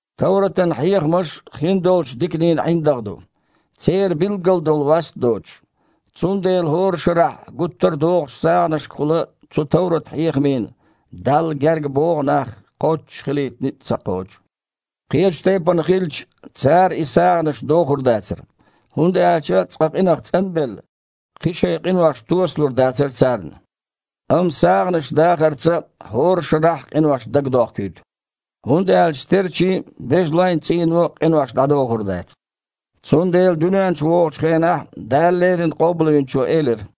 Товратан хьехамаш хин долчу диканийн ІиндагІ ду, церан билггал долу васт а доцуш. Цундела хІора шарахь гуттар а дохучу сагІанашкахула цу товрат-хьехамийн Далла гергабогІу нах кхоччуш хилийта ницкъ ца кхочу. Кхечу тайпана хилча, цара и сагІанаш дохур дацара, хІунда аьлча цкъа къинах цІан а белла, кхин шайн къинош туосалур дацара царна. Амма сагІанаш дахарца хІора шарахь а къинош дагадохкуьйту. ХІунда аьлча стерчийн а, бежалойн а цІийно къинош дІадохур дац. Цундела дуьнен чу вогІучу хенахь Дала леррина Къобалвинчо элира: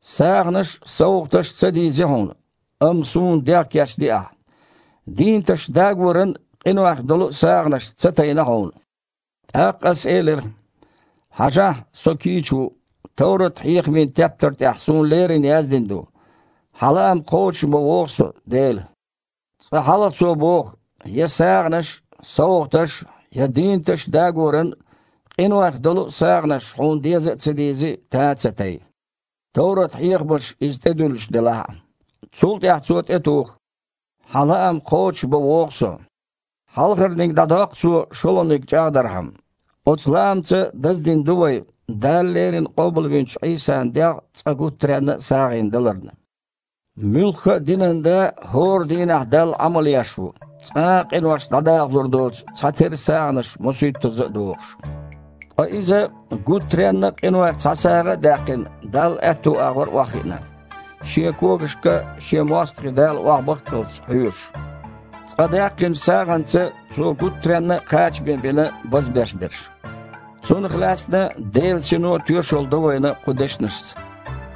«СагІанаш а, совгІаташ а ца дийзи Хьуна, амма Суна дегІ кечди Ахьа. Дийнаташ дагоран а, къинойх долу а сагІанаш ца тайна Хьуна. ТІаккха Ас элира: „Хьажахьа, со кийча ву, товрат-хьехамийн тептар тІехь суна лерина яздина ду. Хьан лаам кхочушбан вогІу Со, Дела“». Цкъа хьалха Цо боху: «Я сагІанаш а, совгІаташ а, я дийнаташ дагоран а, къинойх долу а сагІанаш а Хьуна деза а ца дийзи, тан а ца тай» (товрат-хьехамаша иза тІедуьллуш делахь а). Цул тІаьхьа Цо тІетуху: «Хьан лаам кхочушбан вогІу Со». Хьалхарниг дІадоккху Цо шолгІаниг чІагІдархьама. Оцу лаамца даздина ду вай, Дала леррина къобалвинчу Іийсан дегІ цкъа гуттаренна а сагІина даларна. Муьлхха а динан да хІора дийнахь Далла Іамал еш ву, цкъа а къинош дІадахалур доцу цхьатерра сагІанаш мосуьйттазза а дохуш. Ткъа Иза, гуттаренна а къинойх цхьа сагІа а даьккхина, Далла аьтту агІор охьахиъна, Шен когашка Шен мостагІий Дала охьабахккалц, хьоьжуш. Цкъа даьккхинчу сагІанца Цо гуттаренна а кхачаме бина базбеш берш. Цунах лаьцна Делан Сино а тоьшалла до вайна кху дешнашца: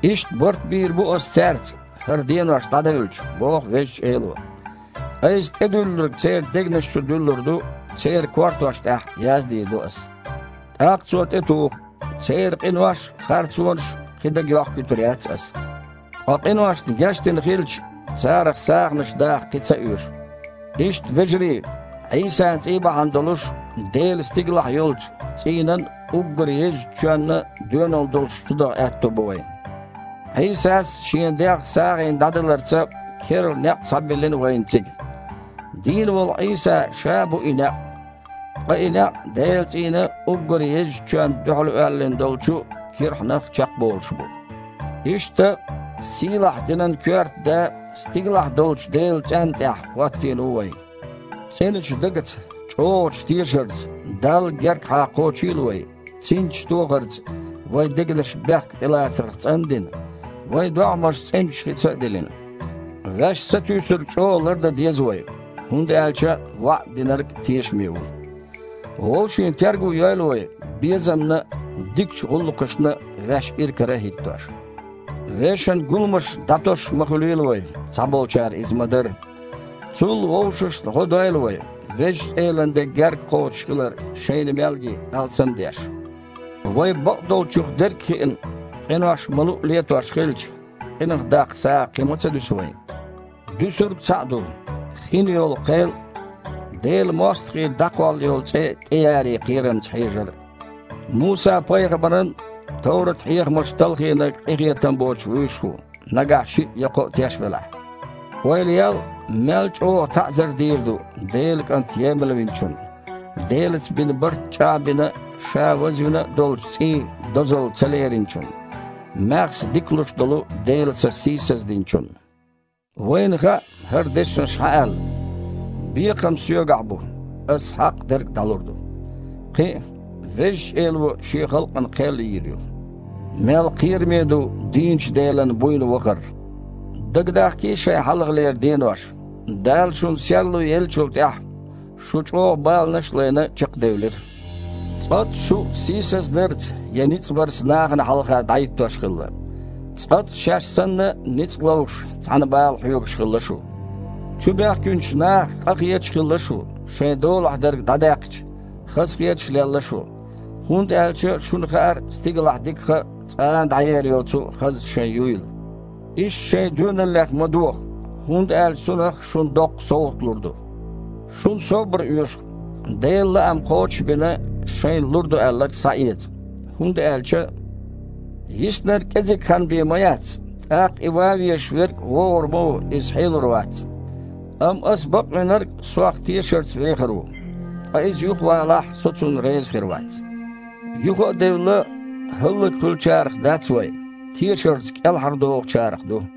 «Иштта барт бийр бу Аса цаьрца, хІара денош дІадевлча, – боху Везачу Эло. – Айса тІедуьллург церан дегнаш чу дуьллур ду, церан кортош тІехь яздийр ду Аса». ТІаккха Цо тІетуху: «Церан къинош а, харцонаш а кхин дага а йохкуьйтур яц Аса». Ткъа къиношна гечдина хилча, царах сагІанаш даха кхин ца оьшу. Иштта, вежарий, Іийсан цІий бахьана долуш Делан стигалахь йолчу цІийнан уггар езачу чоьнна доьналла долуш чудаха аьтто бу вайн. Іийсас, Шен дегІ сагІина дІадаларца, керла некъ схьабиллина вайна цига. Дийна волу Іийса Ша бу и некъ, ткъа и некъ Делан цІийнан уггар езачу чоьнна дуьхьал оьллина долчу кирхьанах чекхболуш бу. Иштта, сийлахь динан коьрта да стигалахь долчу Делан цІенна тІехь хІоттийна ву вайн. ЦІеначу дагаца, чІогІачу тешарца Далла гергахьа кхочийла вай, цинцаш тохарца вайн дегнаш бехк тІелацарх цІан а дина, вайн догІмаш цІеначу хица а дилина. Ваьш сатуьйсург чІогІа лардан деза вай, хІунда аьлча ваІда Динарг тешаме ву. Вовшийн терго йойла вай, безамна а, дикачу гІуллакхашна а ваьш иракара а хІиттош. Вешан гуламаш дІатосуш ма хуьлийла вай, цхьаболчара иза ма-дарра. Цул а вовшашна гІо дойла вай, Везачу Элан де гергакхочуш хилар шайна мел ги, алсам а деш. Вай, бакъдолчух дерг а хиъна, къинош ма-луъу летош хилча, къинах даккха сагІа кхин ма ца дуьсу вайн. Дуьсург цхьаъ ду: хинйолу кхел а, Делан мостагІий дІакхоллу йолу цІе а тІеяре кхерамца хьежар. Муса-пайхамаран товрат-хьехамаш талхийнарг къинхетам боцуш вуьш ву, нагахь шиъ я кхоъ теш велахь. Ойла ел, мел чІогІа таІзар дийр ду Делан КІант емалвинчунна, Делаца бина барт чІагІбина а, ша вазвина а долчу цІийн дозалла ца лериначунна, маьхза дика луш долу Делан Са сийсаздинчунна? Вайна хаьа, хІара дешнаш Хьан аьлла: «Бекхам Соьгахь бу, Ас хьакъ дерг дІалур ду». Кхин а: «Везачу Эло Шен халкъана кхел йийр ю». Мел кхераме ду дийначу Делан буйна вахар! Дагадахкийта шайн хьалхалера денош, Дала шуна серло еллачул тІаьхьа, шу, чІогІа баланаш а лайна, чекхдевлира. ЦкъаццІа шу а сийсаздарца я ницкъ барца нахана хьалха дІахІиттош хилла. ЦкъаццІа шаьш санна ницкъ ловш цхьаьна бала хьоьгуш хилла шу. Чубоьхкинчу нахах къахеташ а хилла шу, шайн долахь дерг дІадаьккхича, хазахеташ а лелла шу, хІунда аьлча шуна хаьара стигалахь дикаха а, цкъа а дІаер йоцу а хазна шайн юйла. Иштта шайн доьналлех ма доха, хІунда аьлча цунах шуна доккха совгІат лур ду. Шуна собар оьшу, Делан лаам кхочуш а бина, шайна лур ду аьлларг схьаэца. ХІунда аьлча: «Йиснарг кІезиг хан бен ма яц, тІаккха и ван везаш верг вогІур ма ву – иза хьелур вац. Амма Аса бакъвинарг Сох тешарца вехар ву, ткъа иза юхавалахь, Со цунна реза хир вац». Юха а девлла, хІаллакьхуьлучарах дац вай, тешарца кІелхьардохучарах ду.